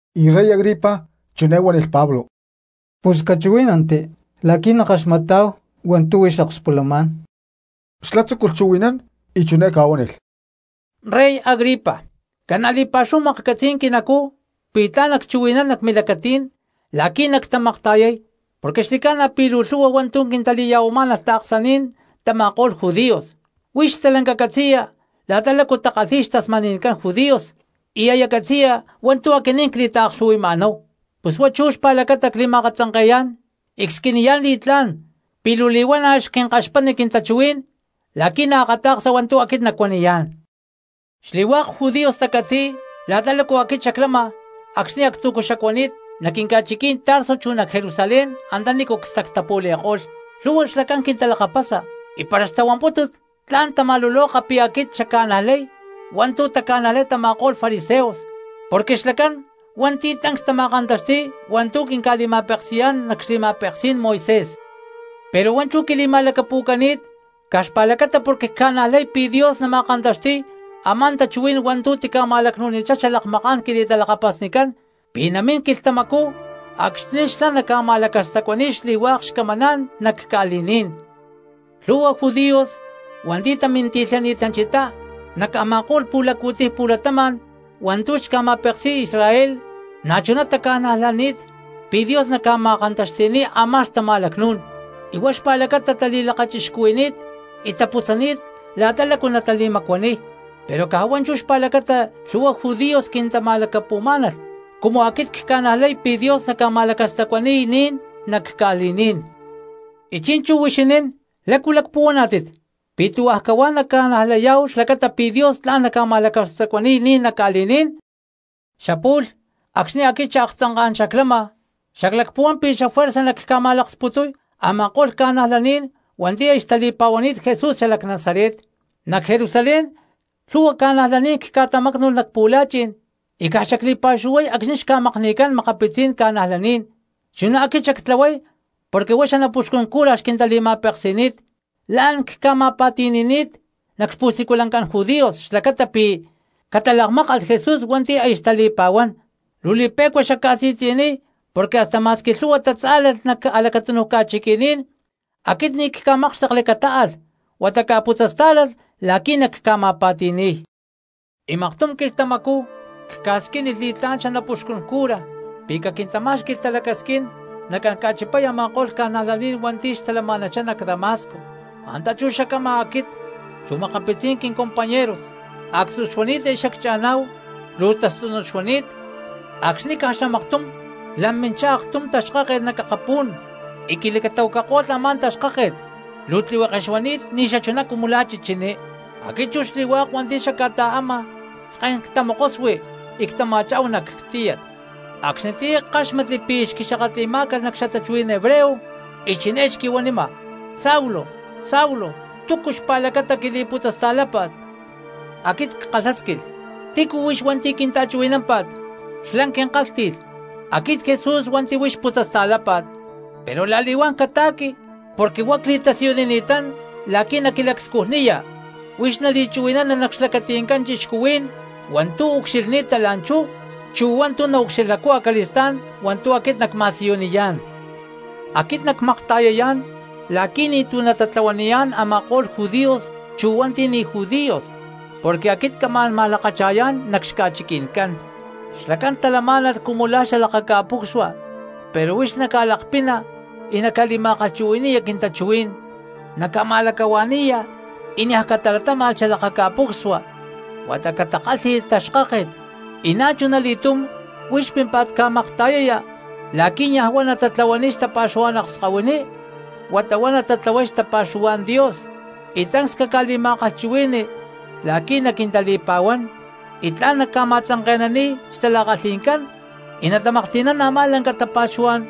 Y Rey Agripa chiné huánilh Pablo: —Pus cachuhuí̠nanti la̠qui̠ nackaxmatá̠hu hua̠ntu̠ huix akspulamá̠n. Xlá tzúculh chuhui̠nán y chiné ca̠huánilh: —Rey Agripa, ca̠na̠ li̠pa̠xúhu maklhcatzi̠y quinacú pi̠ tla̠n nacchuhui̠nán nac milacatí̠n la̠qui̠ nactamakta̠yay porque xli̠ca̠na pi̠ luu lhu̠hua hua̠ntu̠ quintali̠ya̠huamá̠nalh taaksaní̠n tama̠ko̠lh judíos. Huix stalanca catzi̠ya la̠ta lácu takalhíy xtasmani̠ncán judíos, y aya catzi̠ya hua̠ntu̠ aquinín cli̠taaklhu̠hui̠ma̠náhu, pus huá chú xpa̠lacata cli̠ma̠katzanke̠yá̠n y csquiniyá̠n li̠tlá̠n pi̠ luu li̠huana̠ xquinkaxpatni quintachuhuí̠n la̠qui̠ naakata̠ksa hua̠ntu̠ aquit nacuaniyá̠n. ’Xli̠hua̠k judíos tacatzi̠y la̠ta lácu aquit xaclama acxni̠ actzu̠cú xacuani̠t nac quinca̠chiquí̠n Tarso chu nac Jerusalén antanícu cstactapu̠li̠ko̠lh. Lhu̠hua xlacán quintalakapasa y para xtahuampútulh tla̠n tama̠luloka pi̠ aquit xacca̠najlay hua̠ntu̠ taca̠najlay tama̠ko̠lh fariseos, porque xlacán hua̠nti̠ tancs tama̠kantaxti̠y hua̠ntu̠ quinca̠li̠ma̠peksi̠yá̠n nac xli̠ma̠peksí̠n Moisés. Pero huá chú quili̠ma̠lacapu̠cani̠t caj xpa̠lacata porque cca̠najlay pi̠ Dios nama̠kantaxti̠y a̠má xtachuhuí̠n hua̠ntu̠ tica̠ma̠lacnu̠nichá xalakmaká̠n quili̠talakapasnicán, pi̠ namín quilhtamacú acxni̠ xlá naca̠ma̠lacastacuani̠y xli̠hua̠k xcamaná̠n nac ca̠li̠ní̠n. Lhu̠hua judíos hua̠nti̠ taminti̠lhani̠tanchá nac a̠ma̠ko̠lh pu̠laccu̠tiy pu̠latama̠n hua̠ntu̠ xca̠ma̠peksi̠y Israel na̠chuná taca̠najlani̠t pi̠ Dios naca̠ma̠kantaxti̠niy a̠má xtama̠lacnú̠n, y huá xpa̠lacata tali̠lakachixcuhui̠ni̠t y taputzani̠t la̠ta lácu natali̠macuaniy, pero caj huá chú xpa̠lacata lhu̠hua judíos quintama̠lacapu̠má̠nalh cumu aquit cca̠najlay pi̠ Dios naca̠ma̠lacastacuani̠y ni̠n nac ca̠li̠ní̠n. Y chi̠nchú huixinín, ¿lácu lacpuhuaná̠tit? ¿Pi̠ tuhua cahuá naca̠najlayá̠hu xlacata pi̠ Dios tla̠n ca̠ma̠lacastacuani̠y ni̠n nac ca̠li̠ní̠n? ’Xapu̠lh acxni̠ aquit xaaktzanká̠n xaclama xaclacpuhuán pi̠ xafuerza nacca̠ma̠laksputuy a̠ma̠ko̠lh cristianos hua̠nti̠ aya xtali̠pa̠huán Jesús xalac Nazaret. Nac Jerusalén lhu̠hua cristianos cca̠tamácnu̠lh nac pu̠la̠chi̠n y caj xacli̠pa̠xuhuay acxni̠ xca̠makni̠cán makapitzí̠n ca̠najlaní̠n; chuná aquit xactlahuay porque huá xanapuxcun cura xquintali̠ma̠peksi̠ni̠t. La̠n cca̠ma̠pa̠ti̠ni̠ni̠t nac xpu̠siculancán judíos xlacata pi̠ catalakmákalh Jesús hua̠nti̠ aya xtali̠pa̠huán, luu li̠pe̠cua xacca̠si̠tzi̠niy porque hasta ma̠squi lhu̠hua tatzá̠lalh nac a̠lacatúnuj ca̠chiqui̠ní̠n aquit ni̠ cca̠mákxtekli catáalh huata cca̠putzastá̠lalh la̠qui̠ nacca̠ma̠pa̠ti̠ni̠y. ’Y maktum quilhtamacú cca̠squínilh li̠tlá̠n xanapuxcun cura pi̠ caquintamá̠xqui̠lh talacasquín nacán ca̠chipay a̠ma̠ko̠lh ca̠najlaní̠n hua̠nti̠ xtalama̠nanchá nac Damasco. Antá chú xacama aquit chu makapitzí̠n quincompañeros, actzú xuani̠t aya xaccha̠ná̠hu, luu tastúnut xuani̠t, acxni̠ caj xamaktum lam minchá aktum taxkáket nac akapú̠n y quilacatahuacako̠lh a̠má taxkáket, luu tlihueke xuani̠t ni̠xachuná cumu la̠ chichiní. Aquit chu xli̠hua̠k hua̠nti̠ xacca̠ta̠ama lhken ctamokosui y ctama̠chá̠hu nac tíyat, acxnitiyá ckáxmatli pi̠ xquili̠xakatli̠má̠calh nac xatachuhuí̠n hebreo y chiné xquihuanima: “Saulo, Saulo, ¿túcu xpa̠lacata quili̠putzasta̠lápa̠t?” Aquit ckalhásquilh: “¿Tícu huix hua̠nti̠ quinta̠chuhui̠námpa̠t?” Xlá quinka̠lhti̠lh: “Aquit Jesús hua̠nti̠ huix putzasta̠lápa̠t. Pero la̠li̠huán cata̠qui, porque huá cli̠tasiyunini̠tán la̠qui̠ naquilacscujniya, huix nali̠chuhui̠nana nac xlacatí̠n cristianos hua̠ntu̠ ucxilhni̠ta la̠nchú chu hua̠ntu̠ naucxilhacú acali̠stá̠n hua̠ntu̠ aquit nacma̠siyuniyá̠n. Aquit nacmakta̠yayá̠n la̠qui̠ ni̠tu̠ natatlahuaniyá̠n a̠ma̠ko̠lh judíos chu hua̠nti̠ ni̠ judíos porque aquit camá̠n ma̠lakacha̠yá̠n nac xca̠chiqui̠ncán. Xlacán talamá̠nalh cumu la̠ xalakaca̠pucsua pero huix naca̠lakpina y naca̠li̠ma̠kalhchuhui̠ni̠ya quintachuhuí̠n naca̠ma̠lacahua̠ni̠ya y niaj catalatáma̠lh xalakaca̠pucsua huata catakálhi̠lh taxkáket; y na̠chuna li̠túm huix pimpa̠ttá ca̠makta̠yaya la̠qui̠ niaj huá natatlahuaniy xtapa̠xuhuá̠n akskahuiní huata huá natatlahuay xtapa̠xuhuá̠n Dios; y tancs caca̠li̠ma̠kalhchuhui̠ni la̠qui̠ naquintali̠pa̠huán y tla̠n nacca̠ma̠tzanke̠naniy xtala̠kalhi̠ncán y natamaklhti̠nán a̠má lanca tapa̠xuhuá̠n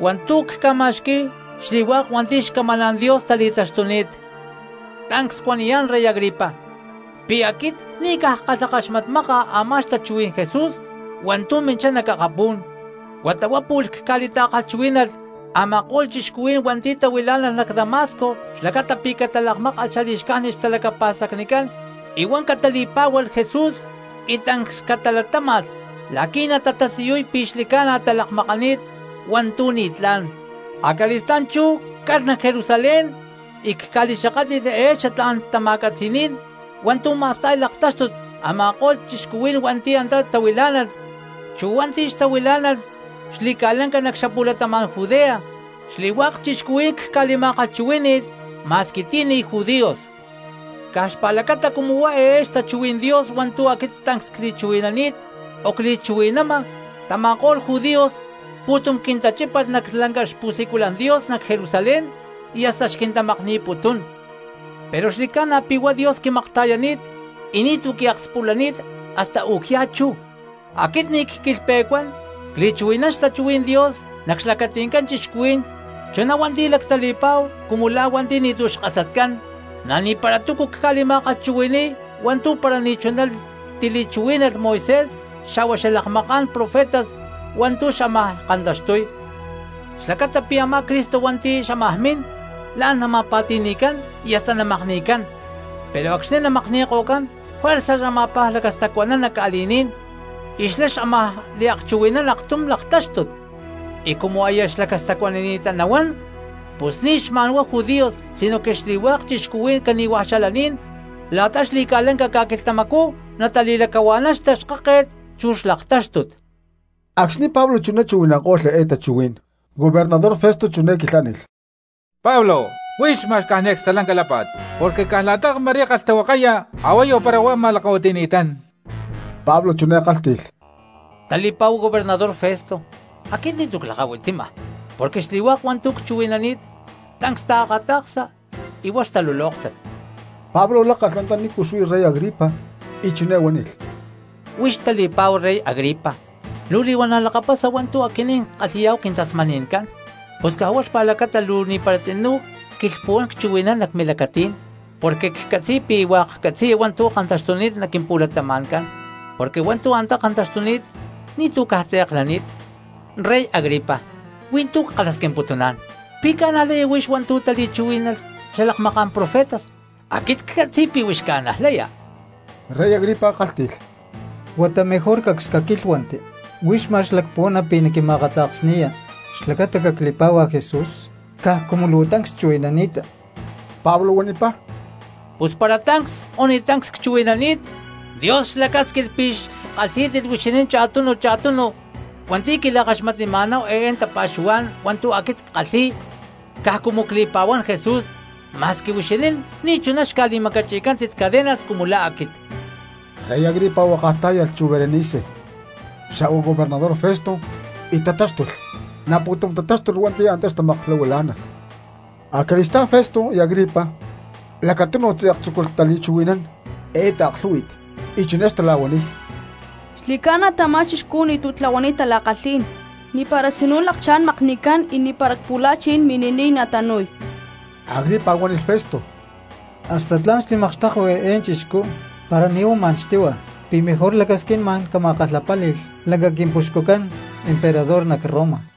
hua̠ntu̠ cca̠ma̠xqui̠y xli̠hua̠k hua̠nti̠ xcamaná̠n Dios tali̠taxtuni̠t.” ’Tancs cuaniyá̠n rey Agripa, pi̠ aquit ni̠ caj ckalhakaxmatmáka a̠má xtachuhuí̠n Jesús hua̠ntu̠ minchá nac akapú̠n, huata pu̠lh huá cca̠li̠ta̠kalhchuhuí̠nalh a̠ma̠ko̠lh cristianos hua̠nti̠ xtahuilá̠nalh nac Damasco xlacata pi̠ catalakmákalh xali̠xcájnit xtalacapa̠stacnicán y huá catali̠pá̠hualh Jesús, y tancs catalatáma̠lh la̠qui̠ natatasiyuy pi̠ xli̠ca̠na talakmakanít hua̠ntu̠ ni̠tlá̠n. Acali̠stá̠n chú calh nac Jerusalén y cca̠li̠xakátli̠lh eé xatlá̠n tama̠catzi̠ní̠n hua̠ntu̠ ma̠sta̠y laktáxtut a̠ma̠ko̠lh cristianos hua̠nti̠ antá xtahuilá̠nalh chu hua̠nti̠ xtahuilá̠nalh xli̠ca̠lanca nac xapu̠latama̠n Judea, xli̠hua̠k cristianos cca̠li̠ma̠kalhchuhuí̠nilh ma̠squi ti̠ ni̠ judíos. Caj xpa̠lacata cumu huá eé xtachuhuí̠n Dios hua̠ntu̠ aquit tancs cli̠chuhui̠nani̠t o cli̠chuhui̠nama tama̠ko̠lh judíos pu̠tum quintachípalh nac lanca xpu̠siculan Dios nac Jerusalén y hasta xquintamakni̠putún. Pero xli̠ca̠na pi̠ huá Dios quimakta̠yani̠t y ni̠tu̠ quiakspulani̠t hasta u̠cyá chú, aquit ni̠ cquilhpe̠cuán cli̠chuhui̠nán xtachuhuí̠n Dios nac xlacati̠ncán cristianos chuná hua̠nti̠ lactali̠pa̠hu cumu la̠ hua̠nti̠ ni̠tu̠ xkasatcán, na̠ ni̠para túcu cca̠li̠ma̠kalhchuhui̠ni̠y hua̠ntu̠ para ni̠chuná tili̠chuhuí̠nalh Moisés xa̠hua xalakmaká̠n profetas hua̠ntu̠ xámaj kantaxtuy, xlacata pi̠ a̠má Cristo hua̠nti̠ xámaj mín la̠n nama̠pa̠ti̠ni̠cán y hasta namakni̠cán, pero acxni̠ namakni̠ko̠cán juerza xama̠paj lacastacuanán nac ca̠li̠ní̠n, y xlá xámaj liakchuhui̠nán aktum laktáxtut, y cumu aya xlacastacuanani̠ttá nahuán pus ni̠ xma̠nhuá judíos sinoque xli̠hua̠k cristianos cani̠hua xalaní̠n la̠ta xli̠ca̠lanca ca̠quilhtamacú natali̠lacahua̠nán xtaxkáket chu xlaktáxtut. Acxni̠ Pablo chuná chuhui̠nanko̠lh eé tachuhuí̠n, gobernador Festo chiné quilhánilh: —¡Pablo, huix ma̠x caj niaj acstalanca lápa̠t! Porque caj la̠ta ma̠rí kalhtahuakaya a̠huayu para huá ma̠lakahuitimá̠n. Y Pablo chiné kálhti̠lh: —Tali̠pa̠hu gobernador Festo, aquit ni̠tu̠ clakahuitima porque xli̠hua̠k hua̠ntu̠ cchuhui̠nani̠t tancs taakata̠ksa y huá xtalulóktat. Pablo lakláca̠lh antaní xuí rey Agripa y chiné huánilh: —Huix tali̠pa̠hu rey Agripa, luu li̠huana̠ lakapasa hua̠ntu̠ aquinín ckalhi̠yá̠hu quintasmani̠ncán, pus caj huá xpa̠lacata luu ni̠para tzinú cquilhpuhuán cchuhui̠nán nac milacatí̠n porque ccatzi̠y pi̠ hua̠k catzi̠ya hua̠ntu̠ kantaxtuni̠t nac quimpu̠latama̠ncán, porque hua̠ntu̠ antá kantaxtuni̠t ni̠tu̠ caj tze̠k lani̠t. Rey Agripa, huí tu̠ ckalhasquimputuná̠n: ¿Pi̠ ca̠najlaya huix hua̠ntu̠ titali̠chuhuí̠nalh xalakmaká̠n profetas? Aquit ccatzi̠y pi̠ huix ca̠najlaya. Rey Agripa kálhti̠lh: —Huata mejor cacs caquílhuanti. ¿Huix ma̠x lacpuhuana pi̠ naquima̠akata̠ksni̠ya xlacata cacli̠pá̠hua Jesús caj cumu luu tancs chuhui̠nani̠ta? Pablo huanipá: —Pus para tancs o ni̠ tancs cchuhui̠nani̠t, Dios xlacásquilh pi̠ xkalhí̠tit huixinín cha̠tunu cha̠tunu hua̠nti̠ quila̠kaxmatnima̠náhu eé tapa̠xuhuá̠n hua̠ntu̠ aquit ckalhi̠y caj cumu cli̠pa̠huán Jesús, ma̠squi huixinín ni̠chuná xca̠li̠macachi̠cántit cadenas cumu la̠ aquit. Rey Agripa huakaj tá̠yalh chu Berenice xa̠hua gobernador Festo y tatáxtulh, na̠ pu̠tum tatáxtulh hua̠nti̠ antá xtamaklahuilá̠nalh. Acali̠stá̠n Festo y Agripa lacatunu tze̠k tzúculh tali̠chuhui̠nán eé taaklhú̠hui̠t, y chiné xtala̠huaniy: —Xli̠ca̠na pi̠ tamá chixcú ni̠tu̠ tlahuani̠t tala̠kalhí̠n, ni̠para tzinú lakchá̠n namakni̠cán y ni̠para cpu̠la̠chi̠n mini̠niy natanu̠y. Agripa huánilh Festo: —Hasta tla̠n xtimakxtekui eé chixcú para ni̠ huá ma̠n xtíhua pi̠ mejor lacasquín ma̠n cama̠kalhapáli̠lh lanca quimpuxcucán emperador nac Roma.